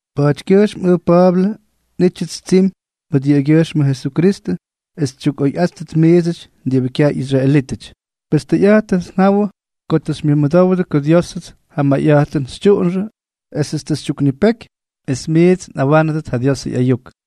Pa̱a̱tykyʉjxm ʉj Pa̱a̱blʉ, nꞌítyʉts tsimy mʉt yʉꞌʉgyʉjxmʉ Jesukristʉ, es xytyukꞌoyꞌáttʉt miidsʉty diꞌibʉ kyaj ꞌyisraelítʉty. Pes tʉyꞌa̱jtʉnʉts njawʉ ko tʉ xymyʉdowdʉ ko Diósʉts ja mayꞌa̱jtʉn xytyuꞌunxʉ esʉts tʉ xytyuknipeky es miits nꞌawánʉdʉt ja Diosʉ ꞌyayuk.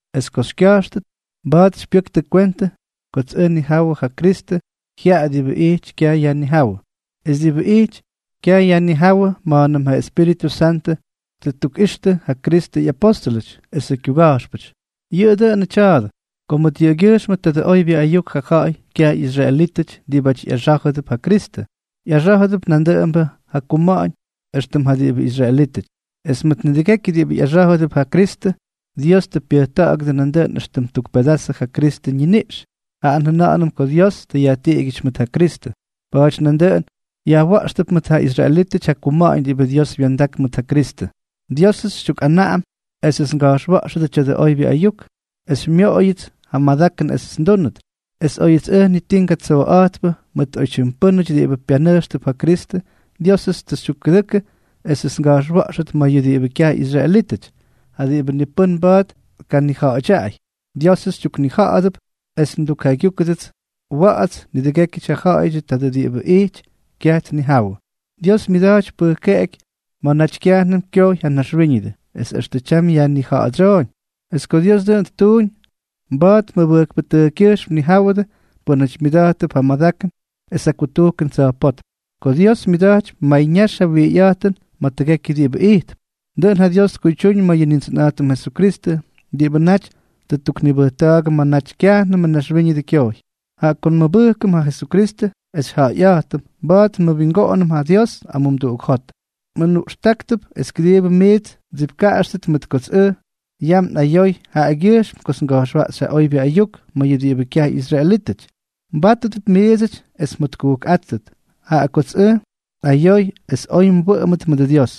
es ko xykya̱jxtʉt, mba̱a̱t xypyʉktʉ kwentʉ kots ʉj nnijawʉ ja Kristʉ jyaꞌa diꞌibʉ ijty kyaj yajnijáwʉ. Es diꞌibʉ ijty kyayajnijáwʉ, na̱a̱mnʉm ja Espíritʉ Santʉ tʉ ttukꞌixtʉ ja Kristʉ ꞌyapóstʉlʉty esʉ kyuga̱jxpʉty. Yʉꞌʉ dʉꞌʉnʉ tya̱a̱dʉ: ko mʉt yʉꞌʉgyʉjxmʉ tadʉ oybyʉ ayuk ja ja̱ꞌa̱y kyaj ꞌyisraelítʉty diꞌibáty ꞌyaxá̱jʉdʉp ja Kristʉ, ꞌyaxá̱jʉdʉp nandʉꞌʉmbʉ ja kuma̱ꞌa̱ñ éxtʉm ja diꞌibʉ israelítʉty. Es mʉt nidʉgekyʉ diꞌibʉ ꞌyaxá̱jʉdʉp ja Kristʉ, Dios tʉ pyʉjta̱ꞌa̱gʉdʉ nandʉꞌʉn éxtʉm tuk pedazʉ ja Kristʉ ñiniꞌx, jaꞌa njʉna̱ꞌa̱nʉm ko Dios tʉ yajtiꞌigyʉty mʉt ja Kristʉ. Pa̱a̱ty nandʉꞌʉn yajwa̱ꞌxtʉp mʉt ja israelítʉty ja kuma̱ꞌa̱ñ diꞌibʉ Dios wya̱ndak mʉt ja Kristʉ. Diósʉts xytyukꞌanaꞌam esʉts nga̱jxwa̱ꞌxʉdʉ tya̱dʉ oybyʉ ayuk, es xymyooyʉts ja madakʉn esʉts ndúnʉt. Es óyʉts ʉj ni ti ngatsooꞌa̱jtpʉ mʉt oytyim pʉ́nʉty diꞌibʉ pyanʉjxtʉp ja Kristʉ, Diósʉts tʉ xytyukkʉdʉkʉ esʉts nga̱jxwa̱ꞌxʉt ma̱ yʉ diꞌibʉ kyaj ꞌyisraelítʉty, ja diꞌibʉ ni pʉ́n mba̱a̱t tkanija̱ꞌa̱dyaꞌay. Diósʉts xytyuknija̱ꞌa̱dʉp es ndukjaygyúkʉdʉts wa̱ꞌa̱ts nidʉgékyʉty ja ja̱ꞌa̱yʉdyʉ tadʉ diꞌibʉ ijty kyayajnijáwʉ, diꞌibʉ myʉda̱jtypy pʉjkeꞌeky ma̱ naty kyajnʉm kyojy ja naxwíñʉdʉ, es extʉ tyam yajnija̱ꞌa̱dsyooñ. Es ko Dios dʉꞌʉn ttuuñ, mba̱a̱t mʉbʉjkpʉtʉjkkyʉjxm tnijáwʉdʉ pʉ́nʉty myʉda̱jttʉp ja madakʉn es ja kutujkʉn tsa̱jpótm, ko Dios myʉda̱jtypy mayñax ja wijyꞌa̱jtʉn ma̱ tʉgekyʉ diꞌibʉ ijtp. Dʉꞌʉn ja Dios tkuydyuuñ ma̱ yʉ Nindsʉnꞌa̱jtʉm Jesukristʉ, diꞌibʉ naty tʉ ttuknibʉjta̱a̱gʉ ma̱ naty kyajnʉmʉ naxwíñʉdʉ kyojy. Jaꞌa ko nmʉbʉjkʉm ja Jesukristʉ es xyjaꞌayꞌa̱jtʉm, mba̱a̱t nmʉwingoꞌonʉm ja Dios amumduꞌuk jot. Nmʉnuꞌxtáktʉp es kʉdiibʉ miits mdsipkaꞌaxtʉt mʉt kots ʉj yam nꞌayoy jaꞌagyʉjxm kots nga̱jxwaꞌxy ja oybyʉ ayuk ma̱ yʉ diꞌibʉ kyaj ꞌyisraelítʉty. Mbátʉdʉp miidsʉty es mjotkujkꞌáttʉt, jaꞌa kots ʉj nꞌayoy es oy mwʉꞌʉmdʉt mʉdʉ Dios.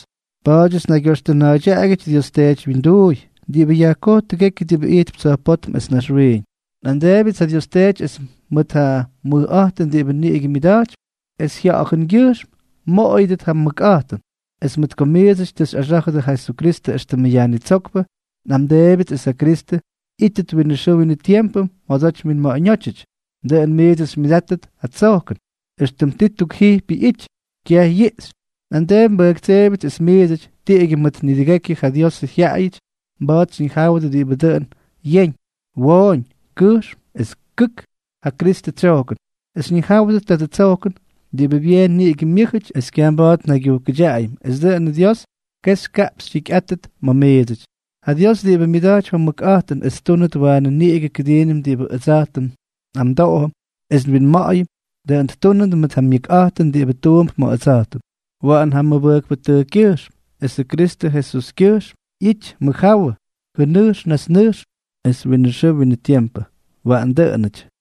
Pa̱a̱dyʉts nnaygyoxtʉna̱a̱ydyaꞌagyʉty Dios Teety wyinduuy, diꞌibʉ yajkoj tʉgekyʉ diꞌibʉ ijtp tsa̱jpótm es naxwiiñ. Nꞌamdeebyʉts ja Dios Teety es mʉt ja mʉjꞌa̱jtʉn diꞌibʉ niꞌigʉ myʉda̱jtypy, es Jya̱ꞌa̱jʉngyʉjxm mmoꞌoyʉdʉt ja mʉkꞌa̱jtʉn, es mʉt ko miidsʉty tʉ xyꞌaxá̱jʉdʉ ja Kristʉ éxtʉmʉ Yajnitsókpʉ, nꞌamdeebyʉts es ja Kristʉ ꞌyítʉt winʉ xʉʉ winʉ tiempʉ mjodoty winma̱ꞌa̱ñótyʉty. Dʉꞌʉn miits xymyʉdáttʉt ja tsojkʉn, éxtʉm ti tukjijpyʉ ꞌyity, kyaj yiꞌxy. Nꞌamdeepy nbʉjktseebyʉts es miidsʉty, tiꞌigyʉ mʉt nidʉgekyʉ ja Diosʉ jyaꞌayʉty, mba̱a̱t xyñijáwʉdʉ diꞌibʉ dʉꞌʉn yeñ, wooñ, kʉjxm es kʉk ja Kristʉ tsyojkʉn, es xyñijáwʉdʉt tadʉ tsojkʉn, diꞌibʉ byeen niꞌigʉ myʉ́jʉty es kyaj mba̱a̱t njaygyujkʉtyaꞌayʉm, es dʉꞌʉn Dios kexy kaꞌpxy jikyꞌátʉt ma̱ miidsʉty. Ja Dios, diꞌibʉ myʉda̱jtypy ja mʉkꞌa̱jtʉn es ttúnʉt waanʉ niꞌigʉ kʉdiinʉm diꞌibʉ ʉdsa̱jtʉm nꞌamdoꞌom es nwinma̱ꞌa̱yʉm, dʉꞌʉn ttúnʉt mʉt ja myʉkꞌa̱jtʉn diꞌibʉ tuump ma̱ ʉdsa̱jtʉm. Waꞌan jaꞌa mʉbʉjkpʉtʉjkkyʉjxm esʉ Kristʉ Jesuskyʉjxm ꞌyity mʉjjáwʉ jʉnʉjx najtsnʉjxʉ es winʉ xʉʉ winʉ tiempʉ. Waꞌan dʉꞌʉnʉty.